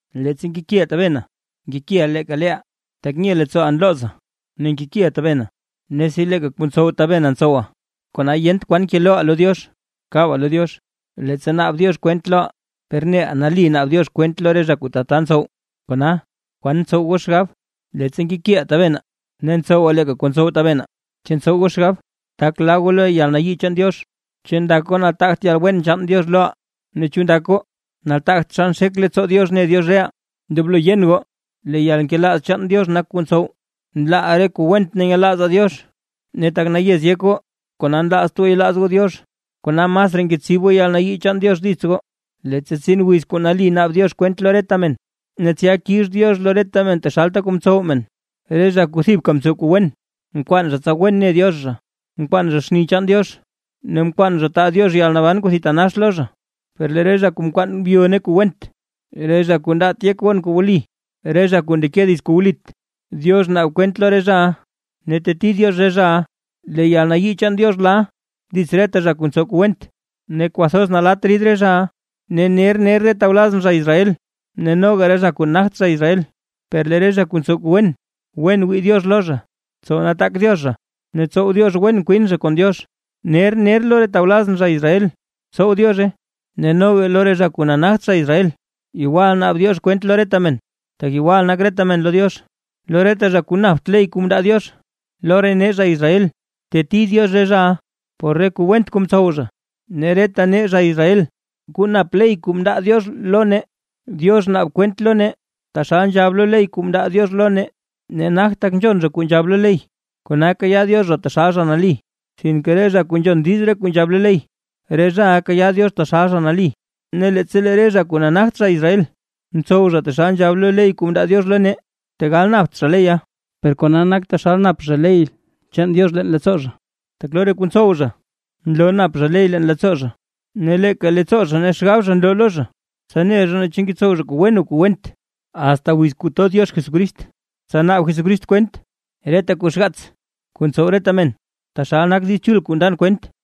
Leettsa nkekiʼaa tabenaa, nkekiʼaa leeka leeʼaa, tak nye leettsooʼaa nloozaa ne nkekiʼaa tabenaa, ne si leeka kuu ntsow tabenaa ntsowaa; kona yent kwan keloʼaa kabaa lo Diox, leettsa naab Diox kwent loʼaa. Per neʼa nali naab Diox kwent lo re zha kuu tata ntsow. Kona, ¿kwan ntsow goo xgab? Leettsa nkekiʼaa tabenaa ne ntsowaa leeka kuu ntsow tabenaa, ¿chu ntsow goo xgab, tak laaʼaa lo yalnayii chaan Diox? ¿Chu ndak goo nataagt yalwen chaan Diox loʼaa ne chu ndak goo nataagt xa nxek leettsoo Diox ne Diox reʼaa? Ndoblo yen goo lee yalnkelaaz chaan Diox nak kuu ntsow, nlaaʼaa re kuu went ne nyelaazaa Diox. Ne tak nayez yek goo, kona nlaazt goo yelaaz goo Diox, kona masraa ngetsib goo yalnayii chaan Diox dits goo, leettsa tsin wiz kuu nali naab Diox kwent lo reta men, ne tsya kix Diox lo reta men taxalta kuu mtsow men. Re zha kuu thibka ntsow kuu wen, nkwaan zha tsa wen ne Diox zha, nkwaan zha xni chaan Diox ne nkwaan zha taa Diox yalnaban kuu thitanax lo zha. Per lee re zha kuu nkwaan byo ne kuu went, re zha kuu ndaat yek gon kuu wli, re zha kuu ndeke dits kuu wlit, Diox naab kwent lo re zhaʼa ne teteti Diox re zhaʼa. Lee yalnayii chaan Diox la dits reta zha kuu ntsow kuu went, ne kwathoz nalatt rid re zhaʼa. Ne ner ner re tawlazʼn zha Israel ne noga re zha kuu nagt zha Israel. Per lee re zha kuu ntsow kuu wen, wen wii Diox lo zha, tsow nataak Diox zha ne tsow Diox wen kwin zha kon Diox. Ner ner lo re tawlazʼn zha Israel tsow Diozhe ne noga lo re zha kuu nagt zha Israel. Yegwal naab Diox kwent lo reta men, tak yegwal nak reta men lo Diox. Lo reta zha kuu napt ley kuu mndaa Diox lo re nee zha Israel, teteti Diox re zhaʼa por re kuu went kuu mtsow zha. Ne reta nee zha Israel kuu nap ley kuu mndaa Diox lo nee, Diox naab kwent lo nee taxal nzhab lo ley kuu mndaa Diox lo nee. Ne nagt tak nzhon zha kuu nzhab lo ley kona kayaa Diox zha taxal zha nali, sinke re zha kuu nzhon diiz re kuu nzhab lo ley, re zhaʼa kayaa Diox taxal zha nali. Ne leettsa lee re zha kuu nagt zha Israel, ntsow zha taxal nzhab lo ley kuu mndaa Diox lo nee, tegal napt zha leya, per kona nak taxal nap zha ley chaan Diox leen leettsoo zha. Tak lo re kuu ntsow zha nloo nap zha ley leen leettsoo zha. Ne leeka leettsoo zha ne xgab zha nloo lo zha, tsa ne zha naa chu ngetsow zha kuu wen o kuu went. Asta wiz kuu to Diox Jesucrist tsa naab Jesucrist kwent reta kuu xgaats kuu ntsow reta men, taxal nak Diiz Chul kuu ndan kwent.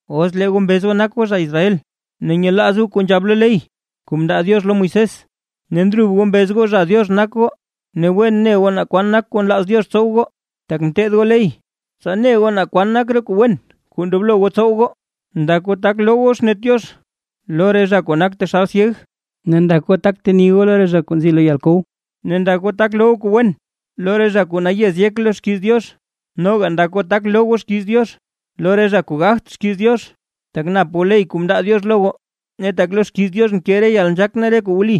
Os lee goo mbez goo nak goo zha Israel, ne nyelaaz goo kuu nzhab lo ley kuu mndaa Diox lo Moisés, ne ndrub goo mbez goo zha Diox nak goo. Ne wen ne goo naa kwan nak kuu nlaaz Diox tsow goo, tak nteed goo ley, tsa ne goo naa kwan nak re kuu wen kuu ndoblo goo tsow goo. Ndak goo tak loo goo xnet Diox lo re zha kuu nak taxal syeg, ne ndak goo tak goo teni goo lo re zha kuu nzi lo yalkow. Ne ndak goo tak loo goo kuu wen lo re zha kuu nayez yek lo xkiiz Diox, noga ndak goo tak loo goo xkiiz Diox lo re zha kuu gagt xkiiz Diox, tak nap goo ley kuu mndaa Diox lo goo, ne tak lo xkiiz Diox nke re yalnzhaak ne re kuu wli.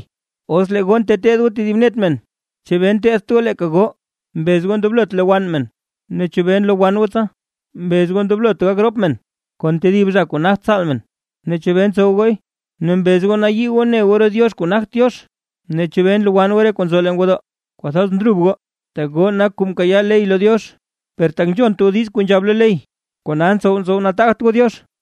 Os lee goo nteteed goo tedib net men. ¿Chebee nteteedt goo leeka goo? Mbez goo ndoblot lowann men, ne ¿chebee nlowann goo tsa? Mbez goo ndoblot gak rop men kon tedib zha kuu nagt tsaal men. Ne ¿chebee ntsow gooy? Ne mbez goo nayii goo ne goo re diox kuu nagt Diox, ne ¿chebee nlowann goo re kuu nzo leen gwodoo? Kwathoz ndrub goo, tak goo nak kuu mkayaa ley lo Diox, per tak nzhont goo kuu nzhab lo ley, kona ntsow ntsow nataagt goo Diox.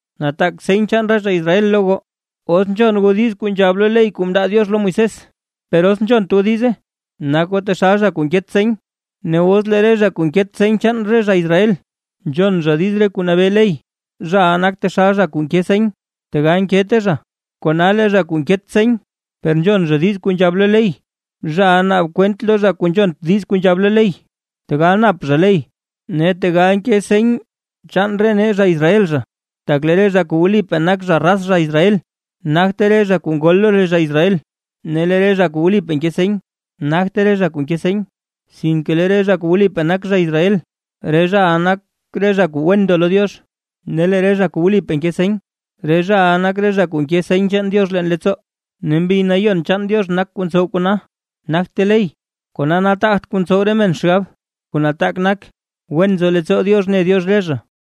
Nataak seny chaan re zha Israel lo goo, os nzhon goo diiz kuu nzhab lo ley kuu mndaa Diox lo Moisés, per os nzhont goo diize, nak goo taxal zha kuu nket seny. Ne os lee zha kuu nket seny chaan re zha Israel, nzhon zha diiz re kuu nabee ley; zhaʼa nak taxal zha kuu nke seny, tegal nkete zha. Kona lee zha kuu nket seny, per nzhon zha diiz kuu nzhab lo ley, zhaʼa naab kwent lo zha kuu nzhont diiz kuu nzhab lo ley, tegal nap zha ley ne tegal nke seny chaan re nee zha Israel. Tak lee re zha kuu wlipaa nak zha raz Israel, nagte re zha kuu ngol lo re zha Israel, ne re zha kuu wlipaa nke seny nagte re zha kuu nke seny. Sinke lee re zha kuu wlipaa nak zha Israel, re zhaʼa nak re zha kuu wen ndo lo Diox; ne lee re zha kuu wlipaa nke seny, re zhaʼa nak re zha kuu nke seny chaan Diox leen leettsoo; ne Mbi Nayon chaan Diox nak kuu ntsow kona nagte ley, kona nataagt kuu ntsow re men xgab, kuu nataak nak wen nzo leettsoo Diox ne Diox re zha.